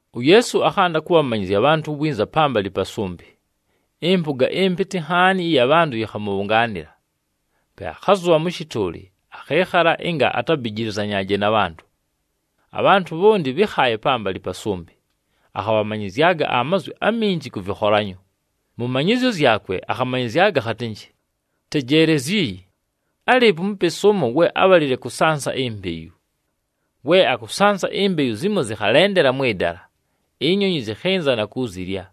UYeesu akhanda kʉbhamanyɨzya abhantʉ winza pambalɨ pa sʉmbɨ. Ɨmpʉga ɨmpɨtɨ nhaani ɨya bhantʉ yɨkhamʉbhʉngaanɨla. Pe akhazʉbha mʉ shɨtʉʉlɨ, akhɨɨkhala ɨnga atabijilizanyaaje na bhantʉ. Abhantʉ bhonti bhɨ́khaaye pambalɨ pa sʉmbɨ. Akhabhamanyɨzyaga amazwi aminji kʉ vɨkholanyo. Mʉ manyɨzyo zyakwe, akhamanyɨzyaga akhatɨnjɨ, “Tejeelezyi, álɨɨpo umupesi ʉmo we ábhalile kʉsansa imbeyu. We akʉsansa, imbeyu zimo zɨkhalendela mwɨ dala, inyonyi zɨkhɨnza na kuzilya.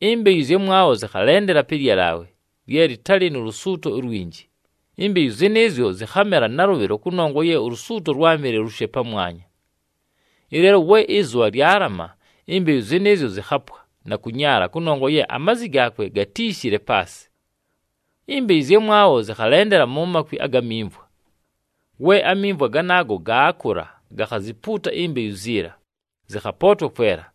Imbeyu ɨzyamwabho zɨkhalendela pɨ lyalaawe lye lɨtalɨ nu lusuuto ulwinji, imbeyu zɨnɨɨzyo zɨkhamela nalʉbhɨlo kʉnongwa ye ulusuuto lwámɨle lushe pamwanya. Ɨleelo we ɨzʉbha lyalama, imbeyu zɨnɨɨzyo zɨkhapwa na kʉnyaala kʉnongwa ye amazi gaakwe gatíishile paasɨ. Imbeyu ɨzyamwabho zɨkhalendela mu makwi aga mimvwa. We amimvwa ganaago gaakʉla, gakhazipuuta imbeyu ziila, zɨkhapootwa kwela.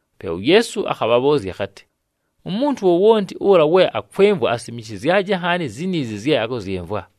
Pe uYeesu akhabhabhʉʉzya akhatɨ, “Umuntu wowonti ʉla we akwɨmvwa, asimishizyaje nhaani ziniizi zye akʉzyɨmvwa!”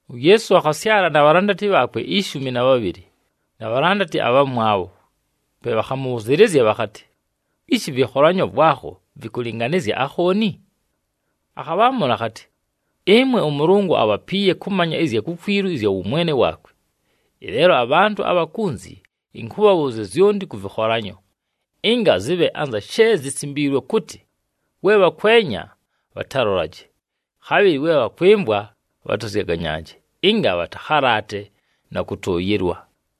UYeesu akhasyala na bhalandati bhaakwe ishumi na bhabhɨlɨ, na bhalandati abhamwabho. Pe bhakhamʉbhʉzɨɨlɨzya bhakhatɨ, “Ishi ɨvɨkholanyo vwakho vɨkʉlɨnganɨzya akhooni?” Akhabhaamʉla akhatɨ, “Ɨmwe ʉMʉlʉngʉ abhapiiye kʉmanya ɨzya kukwilu ɨzya wʉmwene waakwe. Ɨleelo abhantʉ abha kunzi ɨnkʉbhabhʉʉzya zyonti kʉ vɨkholanyo, ɨnga zɨbhe anza she zisimbiilwe kʉtɨ, ‘We bhakwenya, bhatalolaje, khabhɨlɨ we bhakwɨmvwa, bhatazyaganyaaje, ɨnga bhatakhalaate na kʉtʉʉyɨlwa.’”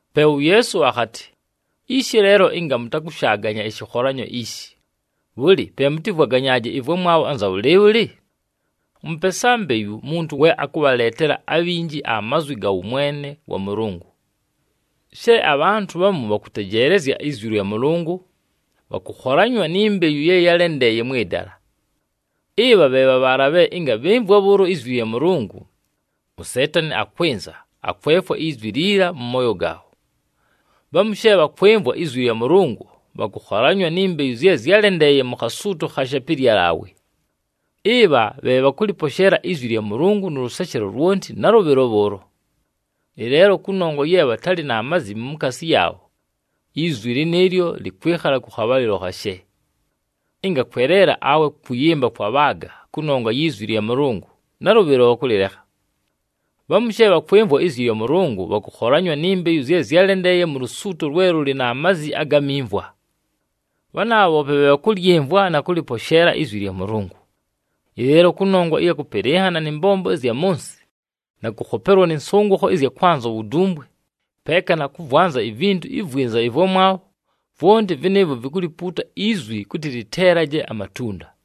Pe uYeesu akhatɨ, “Ishi leelo ɨnga mʉtakʉshaaganya ɨshɨkholanyo ishi, bhʉlɨ, pe mʉtɨvwaganyaaje ɨvwamwabho anza bhʉlɨɨbhʉlɨ? Ʉmʉpesa mbeyu muntu we akʉbhaleetela abhinji amazwi ga wʉmwene wa Mʉlʉngʉ. She abhantʉ bhamu bhakʉtejeelezya izwi lya Mʉlʉngʉ, bhakʉkholanywa ni mbeyu ye yálendeeye mwɨ dala. Ɨbha bhe bha bhaala bhe ɨnga bhɨmvwa bhʉʉlo izwi lya Mʉlʉngʉ, uSeetani akwɨnza, akwefwa izwi liila mʉ mooyo gaabho. Bhamu she bhakwɨmvwa izwi lya Mʉlʉngʉ, bhakʉkholanywa ni mbeyu zye zyálendeeye mu khasuuto khashe pɨ lyalaawe. Ɨbha bhe bhakʉlɨposheela izwi lya Mʉlʉngʉ nʉ lʉseshelo lwonti nalʉbhɨlo bhʉʉlo. Ɨleelo kʉnongwa ye bhatalɨ na mazi mukaasi yaabho, izwi lɨnɨɨlyo lɨkwɨkhala kʉ khabhalɨlo khashe. Ɨnga kweleela awe kʉyɨmba kwabhaaga kʉnongwa yi zwi lya Mʉlʉngʉ, nalʉbhɨlo bhakʉlɨlekha. Bhamu she bhakwɨmvwa izwi lya Mʉlʉngʉ, bhakʉkholanywa ni mbeyu zye zyálendeeye mu lusuuto lwe lʉlɨ na mazi aga mimvwa. Bhanaabha bhoope bhe bhakʉlyɨmvwa na kʉlɨposheela izwi lya Mʉlʉngʉ. Ɨleelo kʉnongwa ɨya kʉpɨlɨnhana nɨ mbombo ɨzya mʉ nsɨ na kʉkhopelwa nɨ nsʉngʉkho ɨzya kwanza uwudumbwe peeka na kʉvwanza ivintu ivwinza ɨvwamwabho, vwonti vɨnɨɨvwo vikulipuuta izwi kʉtɨ lɨteelaje amatunda.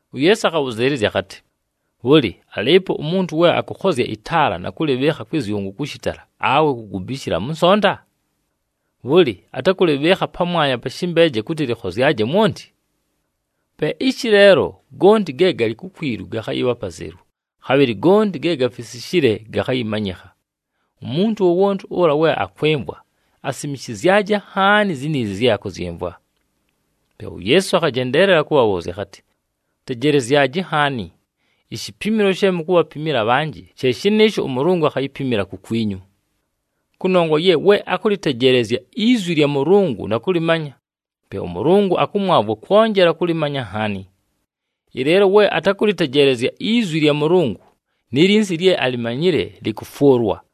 UYeesu akhabhʉzɨɨlɨzya akhatɨ, “Bhʉlɨ, alɨɨpo umuntu we akʉkhozya ɨtaala, na kʉlɨbhɨɨkha kwɨ zyʉngʉ kʉ shɨtala, awe kugubishila mʉ nsonta? Bhʉlɨ, atakʉlɨbhɨɨkha pamwanya pa shɨmbeeje kʉtɨ lɨkhozyaje mwonti? Pe ishi leelo, gonti ge galɨ kukwilu gakhayɨbha apazelu, khabhɨlɨ gonti ge gafisishile gakhayɨmanyɨkha. Umuntu wowonti ʉla we akwɨmvwa, asimishizyaje nhaani ziniizi zye akʉzyɨmvwa!” Pe uYeesu akhajendeelela kʉbhabhʉʉzya, akhatɨ, “Tejelezyaji nhaani! Ishipimilo she mukubhapimila abhanjɨ, she shɨnɨɨsho ʉMʉlʉngʉ akhayipimila kukwinyu. Kʉnongwa ye we akʉlɨtejeelezya izwi lya Mʉlʉngʉ na kʉlɨmanya, pe ʉMʉlʉngʉ akʉmwavwa kwonjela kʉlɨmanya nhaani. Ɨleelo we atakʉlɨtejeelezya izwi lya Mʉlʉngʉ, ni linsi lye alimanyile lɨkʉfwʉlwa.”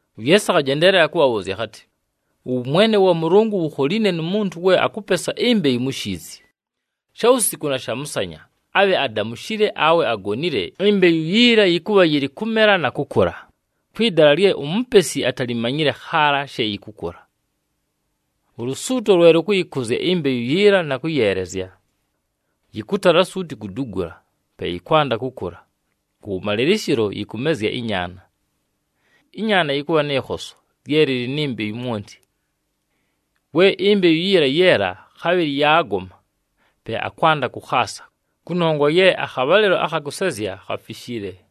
UYeesu akhajendeelela kʉbhabhʉʉzya akhatɨ, “Ʉwʉmwene wa Mʉlʉngʉ wukholiine nu muntu we akʉpesa imbeyu mu shiizi. Shawusiku na shamʉsanya, abhe adamushile awe agonile, imbeyu yiila yɨkʉbha yɨlɨ kʉmela na kʉkʉla, kwɨ dala lye umupesi atalimanyile khaala she yɨkʉkʉla. Ulusuuto lwe lʉkʉyɨkʉzya imbeyu yiila na kʉyeelezya. Yɨkʉtala suuti kudugula, pe yɨkwanda kʉkʉla, kʉwʉmalɨlɨshɨlo yɨkʉmezya ɨnyaana. Ɨnyaana yɨkʉbha nɨ khoso lye lɨlɨ ni mbeyu mwonti. We imbeyu yiila yeela, khabhɨlɨ yaagoma, pe akwanda kʉkhaasa, kʉnongwa ye akhabhalɨlo akha kʉsezya khafishile.”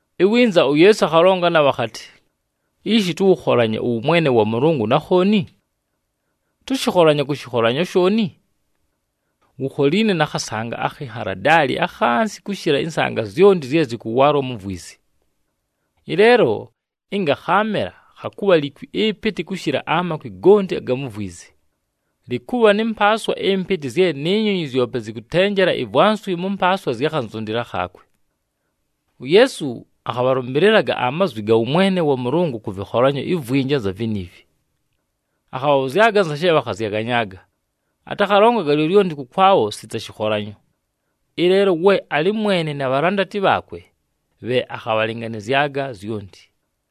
Iwinza uYeesu akhalonga nabho akhatɨ, “Ishi tʉwʉkholanye ʉwʉmwene wa Mʉlʉngʉ na khooni? Tʉshɨkholanye kʉ shɨkholanyo shooni? Wukholiine na khasanga akhi nhaladaali akhansi kʉshɨla ɨnsanga zyonti zye zɨkʉwaalwa mu vwizi. Ɨleelo ɨnga khaamela, khakʉbha likwi ɨpɨtɨ kʉshɨla amakwi gonti aga mu vwizi. Lɨkʉbha nɨ mpaaswa ɨmpɨtɨ zye ni nyonyi zyope zɨkʉtenjela ivwanswi mʉ mpaaswa zya khanzundila khaakwe.” UYeesu akhabhalʉmbɨlɨlaga amazwi aga wʉmwene wa Mʉlʉngʉ kʉ vɨkholanyo ivwinji anza viniivi. Akhabhabhʉzyaga anza she bhakhazyaganyaaga. Atakhalongaga lyolyonti kʉkwabho sita shɨkholanyo. Ɨleelo we alɨ mwene na bhalandati bhaakwe, bhe akhabhalɨnganɨzyaga zyonti.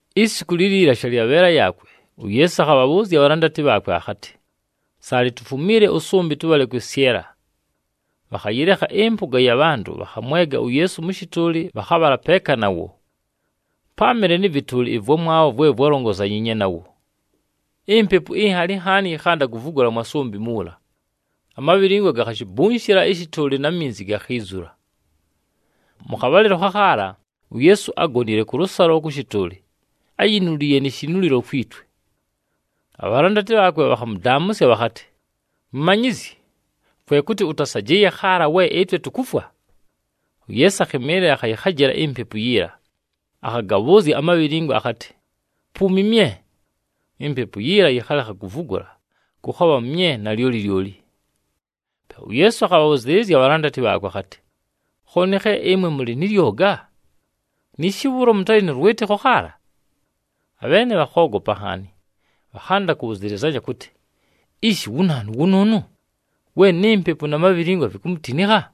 Isiku liliila, shalyabheela yaakwe, uYeesu akhabhabhʉʉzya abhalandati bhaakwe akhatɨ, “Saalɨ, tufumiile ʉsʉmbɨ, tʉbhale kwɨsyɨla.” Bhakhayɨlekha ɨmpʉga ya bhantʉ, bhakhamwega uYeesu mʉ shɨtʉʉlɨ bhakhabhala peeka nawo. Páamɨle nɨ vɨtʉʉlɨ ɨvwamwabho vwe vwalongozanyiinye nawo. Impepu inhali nhaani yɨkhanda kuvugula mwa sʉmbɨ muula. Amabhilingwa gakhashibunshila ɨshɨtʉʉlɨ na minzi gakhiizula. Mʉ khabhalɨlo khakhaala, uYeesu ágonile kʉlʉsalo kʉ shɨtʉʉlɨ, áyinuliiye ni shinulilo kwi twe. Abhalandati bhaakwe bhakhamʉdaamʉsya, bhakhatɨ, “Mumanyizyi, kwe kʉtɨ ʉtasajɨɨye khaala we ɨtwe tukufwa?” Pe uYeesu akhɨmɨɨlɨla akhayɨkhajɨla impepu yiila, akhagabhʉʉzya amabhilingwa akhatɨ, “Puumi mye!” Impepu yiila yɨkhalekha kuvugula, kʉkhabha mye nalyoli lyoli. Pe uYeesu akhabhabhʉzɨɨlɨzya abhalandati bhaakwe akhatɨ, “Khooni khe ɨmwe mʉlɨ nɨ lyoga? Niishi bhʉʉlo mʉtalɨ nʉ lwɨtɨkho khaala?” Abheene bhakhoogopa nhaani, bhakhanda kʉbhʉzɨlɨzanya kʉtɨ, “Ishi wu naanu wʉnʉʉnʉ we ni mpepu na mabhilingwa vikumutinikha?”